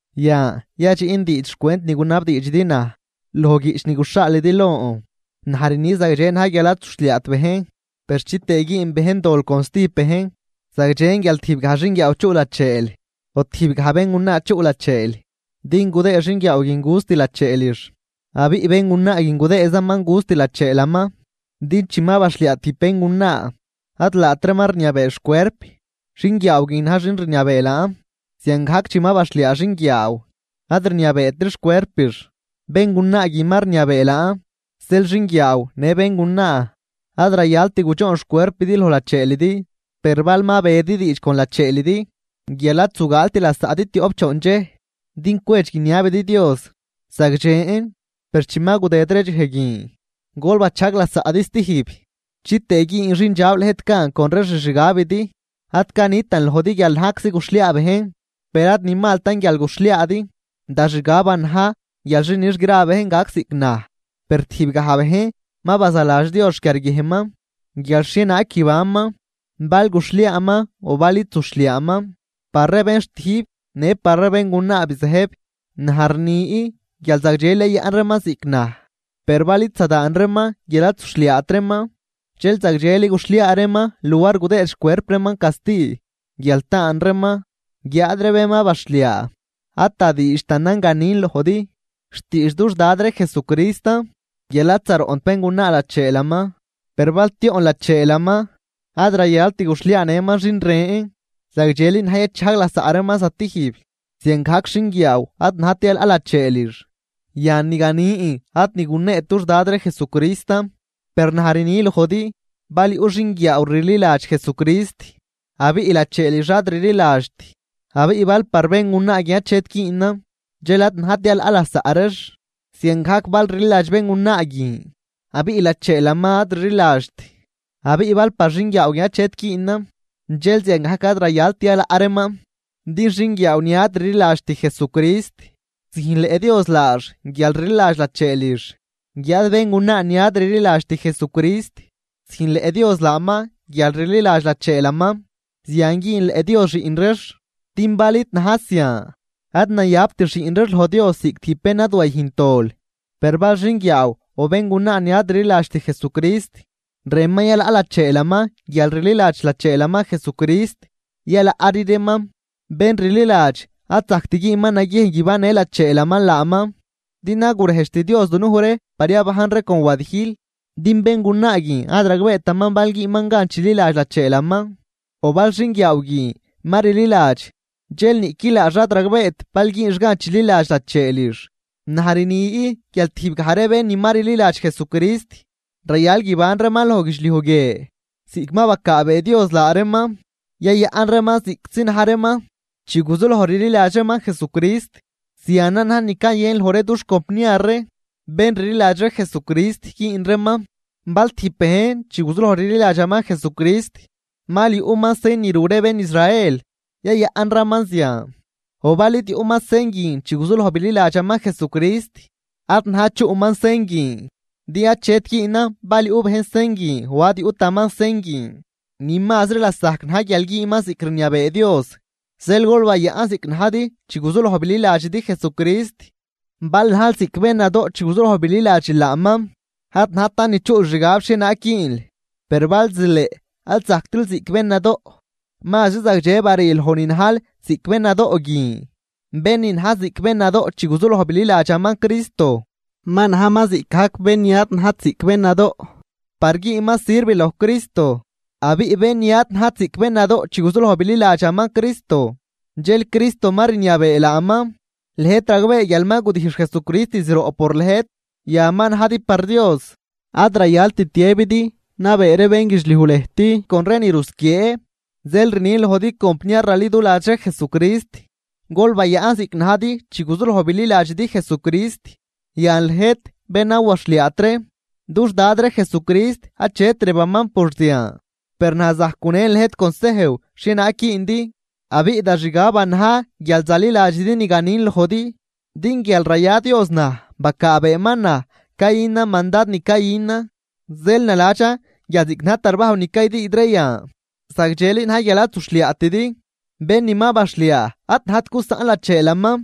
Yan, yadxiꞌn diidx xcwent ni gunabdiidxidi naj loj guiꞌch ni guxhaalidi lon. Naj rni zagdxe na̱j guial ad zuxhliaat bejn. Per chitëë güün bejn dol con stijb bejn, zagdxen guial tijb gaj xinguiaaw chuꞌ lacheel o tijb gaj béngunaa chuꞌ lacheel, din gudëë xinguiaaw guin gust lacheelix abiꞌ béngunaa guin gudëëzaman gust lacheelaman. Din chi ma baxhliaa tijb béngunaa ad laatraman rniabee xcuerp, xinguiaaw guin na̱j xin rniabee laan. Ziangajc chi ma baxhliaa xinguiaaw, ad rniabeetri xcuerpix, béngunaa guin ma rniabee laan. Zeel xinguiaaw në béngunaa ad rayalt gudxoon xcuerpidi loj lacheelidi. Per bal ma bedi diidx con lacheelidi guial ad zugaalt lasaꞌdi tioꞌp choon dxej din cwedx guiniabidi Dios, zagdxen. Per chi ma gudëd ree dxej guin, gol bachajg lasaꞌdi stijb chitëë güün xindxab lëjt gan con ree xixgabidi. Ad canitan lojdi guial najczi guxhliaa bejn, per ad ni maltan guial guxhliaadi. Da xgaban na̱j guial xi nix gra ree bejn gac ziꞌc naj, per tijb gaj bejn ma bazaladx Dios xquiarguiejnman guial xhienaag guibanman, bal guxhliaaman o bal id zuxhliaaman. Par ree bén xtijb në par ree béngunaa bizëjb, naj rni guial zagdxeli yayaꞌn reeman ziꞌc naj. Per bal id zadaan reeman guial ad zuxhliaat reeman, dxel zagdxeli guxhliaa reeman luar gudëëd xcuerp reeman casti guial taan reeman. Guiáad ree bén ma baxhliaa, ad da diidxtanan ganin lojdi, xtiidx dux Dad ree Jesucristan guial ad zaroꞌnt béngunaa lacheelaman. Per bal tioꞌn lacheelaman ad rayalt guxhliaanëman xin ren, zagdxeli na̱j yachajg lasaꞌ reeman stijb. Ziangajc xinguiaaw ad najt yalaꞌ lacheelix. Yan, ni ganin ad ni guneet dux Dad ree Jesucristan, per naj rni lojdi: Bal yuꞌ xinguiaaw rliladx Jesucrist abiꞌ lacheelix ad rliladxt, abiꞌ bal par béngunaa guin achet güünan, dxel ad najt yalaꞌ lasaꞌ reex. Ziangajc bal rliladx béngunaa guin abiꞌ lacheelaman ad rliladxt, abiꞌ bal par xinguiaaw guin achet güünan, dxel ziangajc ad rayalt yalaꞌ reeman. Din xinguiaaw ni ad rliladxt Jesucrist, züjnleꞌ Dios laax guial rliladx lacheelix. Guiáad béngunaa ni ad rliladxt Jesucrist züjnleꞌ Dios laaman guial rliladx lacheelaman, zian güünleꞌ Dios xiꞌn reex. Din bal id na̱j zian, ad nayabt xiꞌn reex loj Dios ziꞌc tijb bén ni ad wayüjnt dol. Per bal xinguiaaw o béngunaa ni ad rliladxt Jesucrist rënman yalaꞌ lacheelaman guial rliladx lacheelaman Jesucrist, yalaꞌri reeman. Bén rliladx ad zajct güünman naguiejn guibannë lacheelaman laaman din ad gurejdxt Dios dunuj ree par yabajn ree con wadijl. Din béngunaa guin ad ragbeetaman bal güünman gan chililadx lacheelaman, o bal xinguiaaw guin ma rliladx dxel niꞌqui laax ad ragbeet bal güünx gan chililadx lacheelix. Naj rni guial tijbgaj ree bén ni ma rliladx Jesucrist rayal guiban reeman loj guidxliuj guie ziꞌc ma bacaabee Dios laa reeman, yayaꞌn reeman ziꞌctzi na̱j reeman chi guzuloj rliladx reeman Jesucrist. Zianan na̱j ni cayën loj ree dux compniar ree bén rliladx ree Jesucrist güün reeman. Bal tijb bejn chi guzuloj rliladxaman Jesucrist mal yuꞌman sen ni ru ree bén Israel, yayaꞌnraman zian. O bal id yuꞌman sen guin chi guzuloj bililadxaman Jesucrist, ad najt chuꞌman sen guin. Din achet güünan bal yuꞌ bejn sen guin o ad yuꞌtaman sen guin, ni mazri lasajc na̱j guial güünman ziꞌc rniabee Dios. Zeel gol bayaꞌn ziꞌc najdi chi guzuloj bililadxidi Jesucrist. Bal najl ziꞌc bén nadoꞌ chi guzuloj bililadxil laaman, ad najtan ni chuꞌl xgab xhienaag güünl. Per bal zileꞌ ad zajctril ziꞌc bén nadoꞌ, mazri zagdxe barii loj ni najl ziꞌc bén nadoꞌ guin. Bén ni na̱j ziꞌc bén nadoꞌ chi guzuloj bililadxaman Cristo ma najman ziꞌcgajc bén ni ad najt ziꞌc bén nadoꞌ par güünman sirv loj Cristo. Abiꞌ bén ni ad najt ziꞌc bén nadoꞌ chi guzuloj bililadxaman Cristo, dxel Cristo ma rniabee laaman. Lëjt ragbee guial ma gudijx Jesucrist zroꞌ por lëjt, yan ma najdi par Dios. Ad rayalt tiëbidi nabee ree bénguidxliuj lëjt con ree ni rusquiee. Zeel rnin lojdi compniar raliduladx ree Jesucrist, gol bayaꞌn ziꞌc najdi chi guzuloj bililadxidi Jesucrist. Yan lëjt bén ad waxhliaat ree, dux Dad ree Jesucrist achet rëbaman por zian. Per naj zajc gunen lëjt consejw xhienaag güündi, abiꞌ da xgaban na̱j guial zaliladxidi ni ganin lojdi din guial raya Dios naj bacaabeeman naj cayünan mandad ni cayünan. Zeel naladxan guial ziꞌc na̱j tarbajw ni caydüüd ree yan, zagdxeli na̱j guial ad zuxhliaatidi. Bén ni ma baxhliaa ad najt gusaꞌn lacheelaman.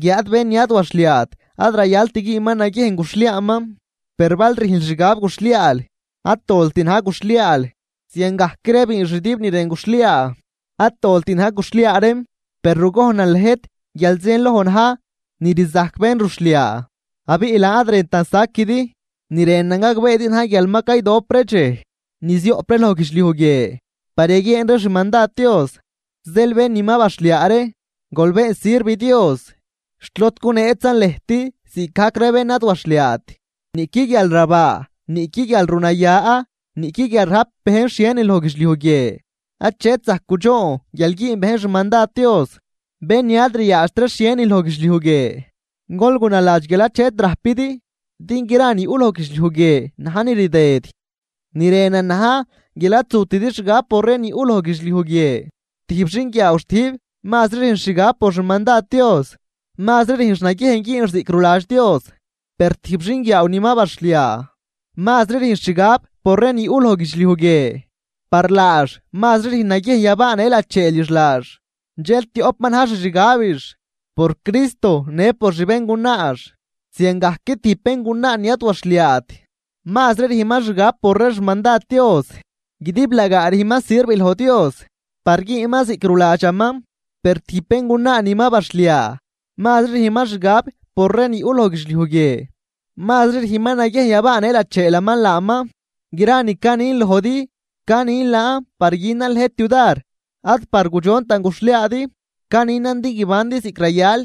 Guiáad bén ni ad waxhliaat ad rayalt güünman naguiejn guxhliaaman. Per bal rüjnl xgab guxhliaal, ad dolt na̱j guxhliaal. Ziangajc ree biinxdüb ni rën guxhliaa, ad dolt na̱j guxhliaa reem. Per rugojnan lëjt guial zienloj na̱j ni rzajc bén ruxhliaa, abiꞌ laan ad rëntan saquidi. Ni rënan gagbeedi na̱j guial ma caydop ree dxej ni zioꞌp ree loj guidxliuj guie par yaguieen ree xmandad Dios. Zeel bén ni ma baxhliaa ree gol been sirv Dios xt lod guneetzan lëjt ziꞌcgajc ree bén ni ad waxhliaat. Niꞌqui guialrabaa, niꞌqui guialrunaya, niꞌqui guial rajp bejn xhienin loj guidxliuj guie achet zajc gudxoon guial güün bejn xmandad Dios. Bén ni ad ryaadxt ree xhienin loj guidxliuj guie, gol gunaladx guial achet rajpidi, din gra ni yuꞌ loj guidxliuj guie najn ni rdëd. Ni rënan na̱j guial ad zutidi xgab por ree ni yuꞌ loj guidxliuj guie. Tijb xinguiaaw xtijb mazri rüjnx xgab por xmandad Dios, mazri rüjnx naguiejn güünx ziꞌc ruladx Dios. Per tijb xinguiaaw ni ma baxhliaa mazri rüjnx xgab por ree ni yuꞌ loj guidxliuj guie, par laax mazri rüjn naguiejn yabaanë lacheelix laax. Dxel tioꞌp ma na̱j xixgabix, por Cristo në por xbéngunaax. Ziangajc tijb béngunaa ni ad waxhliaat mazri rüjnman xgab por ree xmandad Dios guidiblagaa rüjnman sirv loj Dios par güünman ziꞌc ruladxaman. Per tijb béngunaa ni ma baxhliaa mazri rüjnman xgab por ree ni yuꞌ loj guidxliuj guie, mazri rüjnman naguiejn yabaanë lacheelaman laaman. Gra ni canin lojdi, canin laan par günan lëjt yudar ad par gudxontan guxhliaadi, caninan din guibandi ziꞌc rayal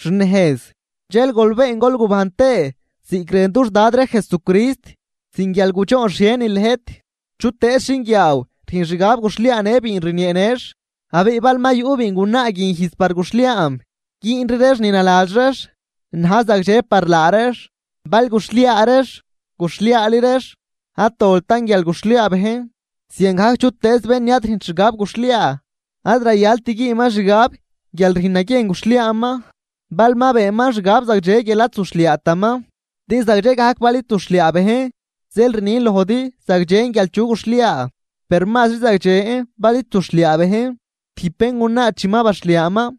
xnejz dxel gol been gol gubajn tëë ziꞌc rën dux Dad ree Jesucrist sin guial gudxoon xhienin lëjt. Chutëëz xinguiaaw rüjn xgab guxhliaanë biin rnieenëx abiꞌ bal ma yuꞌ biingunaa guin ijz par guxhliaam, güünri reex ni naladx reex na̱j zagdxe par laa reex. Bal guxhliaa reex, guxhliaari reex. Ad doltan guial guxhliaa bejn. Ziangajc chutëëz bén ni ad rüjnt xgab guxhliaa, ad rayalt güünman xgab guial rüjn naguiejn guxhliaaman bal ma beenman xgab zagdxe guial ad zuxhliaataman. Din zagdxe gajcan bal id zuxhliaa bejn. Zeel rnin lojdi zagdxen guial chu guxhliaa, per mazri zagdxe bal id zuxhliaa bejn. Tijb béngunaa chi ma baxhliaaman,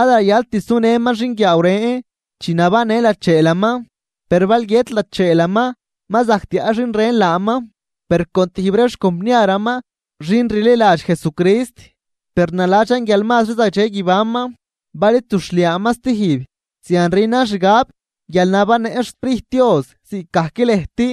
ad rayalt sunëman xinguiaaw ren chi nabannë lacheelaman. Per bal guiët lacheelaman ma zajc tiaꞌ xin ren laaman per con tijb ree xcompniaraman xin rliladx Jesucrist. Per naladxan guial mazri zagdxe guibanman bal id zuxhliaaman stijb. Zian rünan xgab guial nabannëꞌn xSprijt Dios ziꞌcgajc lëjt.